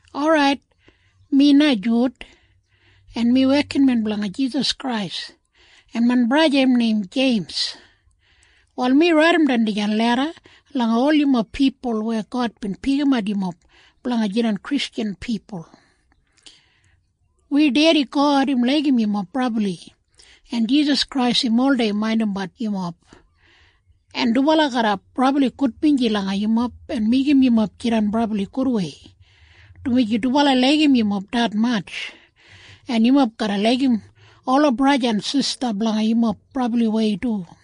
Orait, mi na Jud, en mi wekinmen blanga Jisas Krais, en main braja im neim Jeims. Wal mi raidimbat dijan leda langa ol yumob pipul weya God bin pikimat yumob blanga jidan Kristjan pipul. Wi Dedi God im laigim yumob brabli, en Jisas Krais im oldei maindimbat yumob, en dubala garra brabli gudbinji langa yumob en meigim yumob jidan brabli gudwei, dumaji dubala laigim yumob detmatj. En yumob garra laigim ola braja en sista blanga yumob brabliwei du.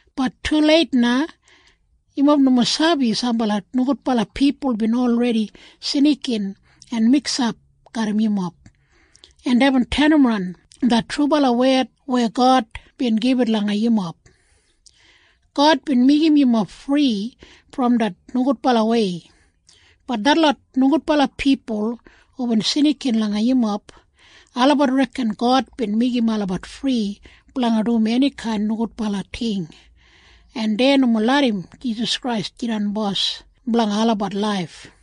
Bat tuleit na. Yumob nomo sabi sambala nogudbala pipul bin olredi snikin en miksap garram yumob, en deibin tenimran det trubala wed weya God bin gibit langa yumob. God bin meigim yumob fri brom det nogudbalawei. Bat detlot nogudbala pipul hubin snikin langa yumob, olabat reken God bin meigim olabat fri blanga dum enikain nogudbala ting, en dei nomo larram Jisas Krais jidan Bos blanga olabat laif.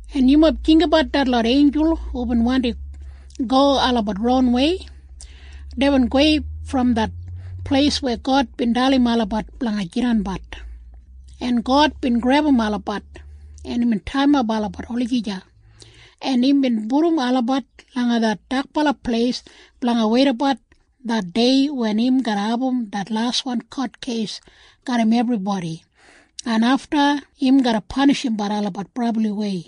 En yumob jinggabat detlot einjul hubin wandim go olabat ronwei. Deibin gowei brom det pleis weya God bin dalim olabat blanga jidanbat, en God bin grebum olabat, en imbin taiyimap olabat olagija, en imbin pudum olabat langa det dakbala pleis blanga weidabat det dei wen im garra abum det laswan kotkeis garram ebribodi, en afta im garra panishimbat olabat brabliwei.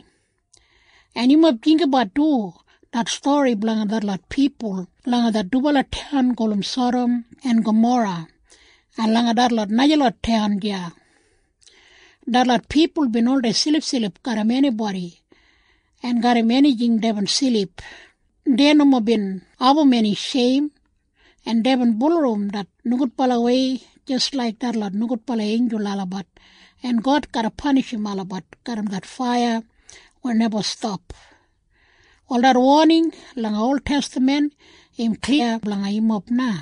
En yumob jinggabat du det stori blanga detlot pipul langa det dubala taun gulum Sadam en Gamora en langa detlot najalot taun deya. Detlot pipul bin oldei silipsilip garram enibodi, en garram enijing deibin silip. Dei nomo bin abum eni sheim, en deibin bulurrum det nogudbalawei jis laik detlot nogudbala einjul olabat, en God garra panishimbat olabat garram det faiya weya neba stap. Wal det woning langa oltestaman im kliya blanga yumob na.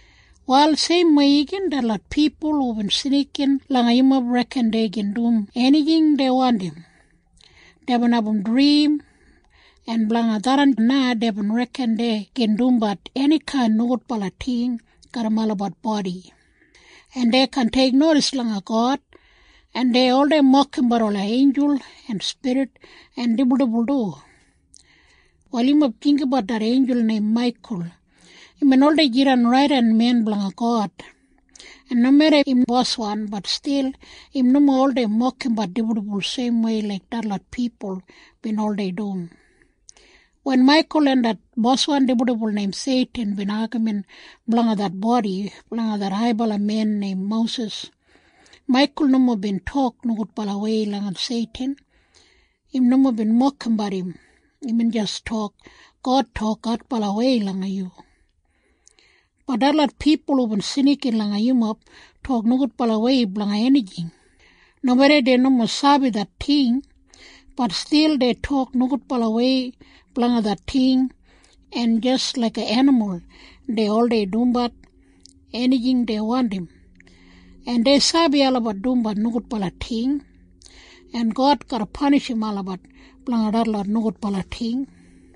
Wal seimwei igin detlot pipul hubin snikin langa yumob reken dei gin dum enijing dei wandim. Deibin abum drim, en blanga tharran na dei reken dei gin dumbat enikain nogudbala ting garram olabat bodi, en dei kaan teiknodis langa God, en dei oldei mokimbat ola einjul en spirit en dibuldibul du. Wal yumob jinggabat det einjul neim Maikul. Imbin oldei jidan raidenmen blanga God. En nomeda im boswan, bat stil im nomo oldei mokimbat dibuldibul seimwei laik detlot pipul bin oldei dum. Wen Maikul en det boswan dibuldibul neim Seitin bin agamin blanga det bodi blanga det haibala men neim Mosis, Maikul nomo bin tok nogudbalawei langa Seitin. Im nomo bin mokimbat im. Imbin jis tok, “God tok adbalawei langa yu.” Bat detlot pipul hubin snikin langa yumob tok nogudbalawei blanga enijing. Nomeda dei nomo sabi det ting, bat stil dei tok nogudbalawei blanga det ting. En jis laiga enimul dei oldei dumbat enijing dei wandim. En dei sabi olabat dumbat nogudbala ting. En God garra panishim olabat blanga detlot nogudbala ting.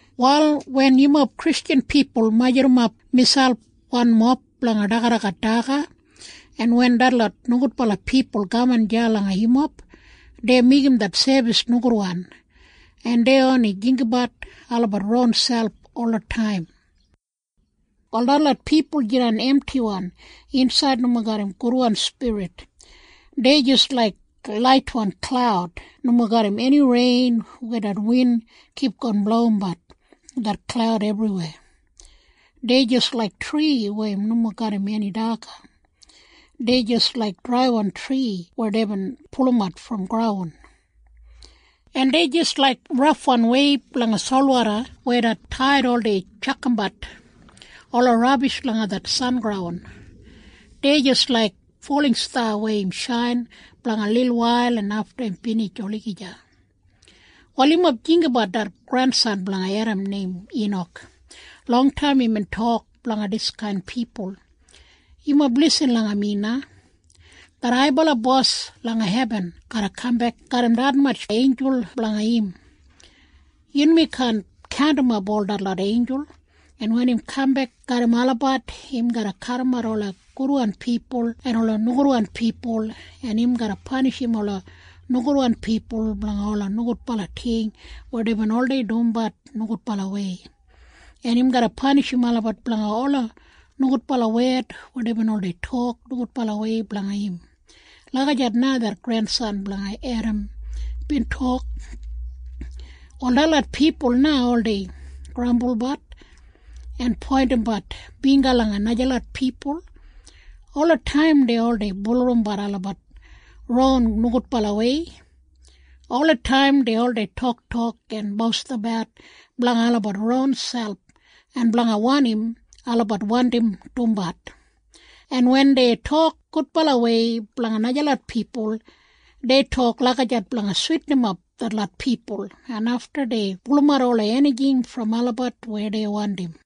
Wal wen yumob Kristjan pipul majurrumap miselp wanmob blanga dagadagat daga, en wen detlot nogudbala pipul kaman deya langa yumob, dei meigim det sebis nogudwan, en dei oni jinggabat olabat ronselp olataim. Wal detlot pipul jidan emtiwan insaid nomo garram gudwan spirit. Dei jis laik laitwan klaud nomo garram eni rein weya det win kipgon blowimbat det klaud ebriweya. Dei jis laik tri weya im nomo garram eni daga. Dei jis laik draiwan tri weya deibin pulumat brom graun. En dei jis laik rafwan weib langa solwoda weya det taid oldei tjakamap ola rabish langa det sengraun. Dei jis laik folingsta weya im shain blanga lilwail en afta im binij olagija. Wal yumob jinggabat det grensan blanga Edam neim Inak. Longtaim imbin tok blanga diskain pipul, “Yumob lisin langa mi na. Det Haibala Bos langa hebin garra kambek garram detmatj einjul blanga im. Yunmi kaan kaundimap ol detlot einjul, en wen im kambek garram olabat, im garra kadimat ola gudwan pipul en ola nogudwan pipul, en im garra panishim ola nogudwan pipul blanga ola nogudbala ting weya deibin oldei dumbat nogudbalawei, en im garra panishim olabat blanga ola nogudbala wed weya deibin oldei tok nogudbalawei blanga im.” Lagijat na det grensan blanga Edam bin tok. Wal detlot pipul na oldei grambulbat en poindimbat bingga langa najalot pipul. Olataim dei oldei bulurrumbat olabat ron nogudbalawei. Olataim dei oldei toktok en bostinabat blanga olabat ronselp en blanga wanim olabat wandim dumbat. En wen dei tok gudbalawei blanga najalot pipul, dei tok lagijat blanga switinimap detlot pipul, en afta dei pulumat ola enijing brom olabat weya dei wandim.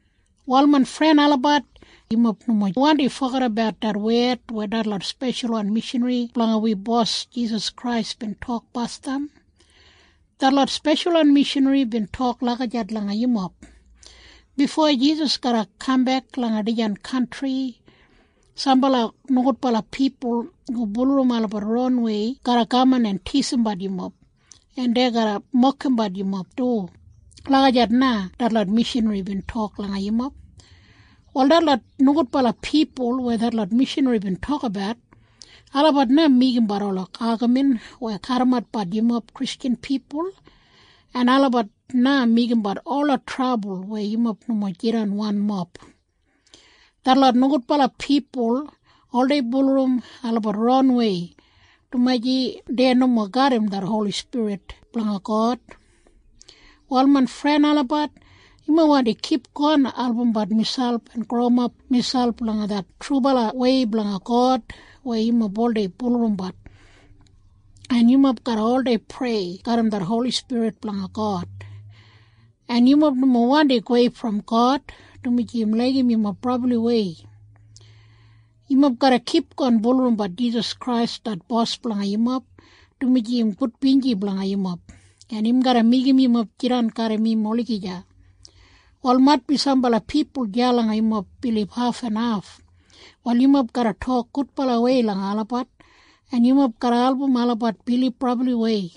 Wal main fren olabat, yumob nomo wandi fogedabat det wed weya detlot speshalwan mishanri blanga wi Bos Jisas Krais bin tok basdam. Detlot speshalwan mishanri bin tok lagijat langa yumob, “Bifo Jisas garra kambek langa dijan kantri, sambala nogudbala pipul hu bulurrum olabat ronwei garra kaman en tisimbat yumob, en dei garra mokimbat yumob du.” Lagijat na detlot mishanri bin tok langa yumob. Wal detlot nogudbala pipul weya detlot mishanri bin tokabat, olabat na meigimbat ola agamin weya kadimatbat yumob Kristjan pipul, en olabat na meigimbat ola trabul weya yumob nomo jidan wanmob. Detlot nogudbala pipul oldei bulurrum olabat ronwei, dumaji dei nomo garram det Holi Spirit blanga God. Wal main fren olabat, yumob wandi kipgon albumbat miselp en growimap miselp langa det trubalawei blanga God weya yumob oldei bulurrumbat. En yumob garra oldei prei garram det Holi Spirit blanga God. En yumob nomo wandi gowei brom God, dumaji im laigim yumob brabliwei. Yumob garra kipgon bulurrumbat Jisas Krais det Bos blanga yumob, dumaji im gudbinji blanga yumob, en im garra meigim yumob jidan garram im olagija. Wal maitbi sambala pipul deya langa yumob bilib hafenhaf. Wal yumob garra tok gudbalawei langa olabat, en yumob garra album olabat bilib brabliwei.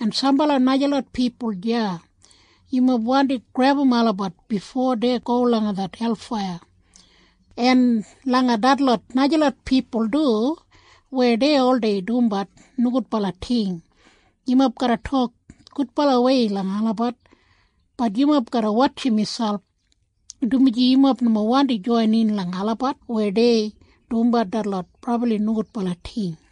En sambala najalot pipul deya, yumob wandi grebum olabat bifo dei go langa det helfaiya. En langa detlot najalot pipul du weya dei oldei dumbat nogudbala ting, yumob garra tok gudbalawei langa olabat. Bat yumob garra wotjim miselp, dumaji yumob nomo wandi joinin langa olabat weya dei dumbat detlot brabli nogudbala ting.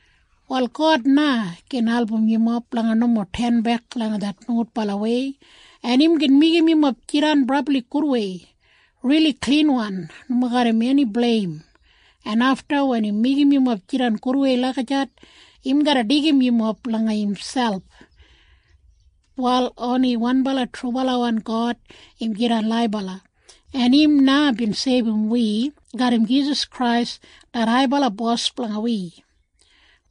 Wal God na gin album yumob blanga nomo tenbek langa det nogudbalawei, en im gin meigim yumob jidan brabli gudwei, rili klinwan nomo garram eni bleim, en afta wen im meigim yumob jidan gudwei lagijat, im garra deigim yumob langa imselp. Wal oni wanbala trubalawan God im jidan laibala, en im na bin seibum wi garram Jisas Krais det haibala Bos blanga wi.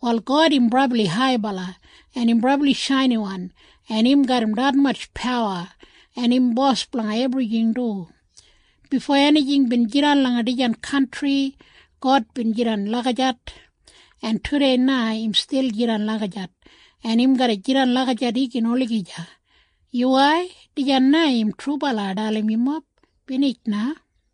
Wal God im brabli haibala, en im brabli shainiwan, en im garram detmatj pawa, en im Bos blanga ebrijing du. Bifo enijing bin jidan langa dijan kantri, God bin jidan lagijat, en tudei na im stil jidan lagijat, en im garra jidan lagijat igin olagija. Yuwai. Dijan na im trubala ai dalim yumob. Binij na.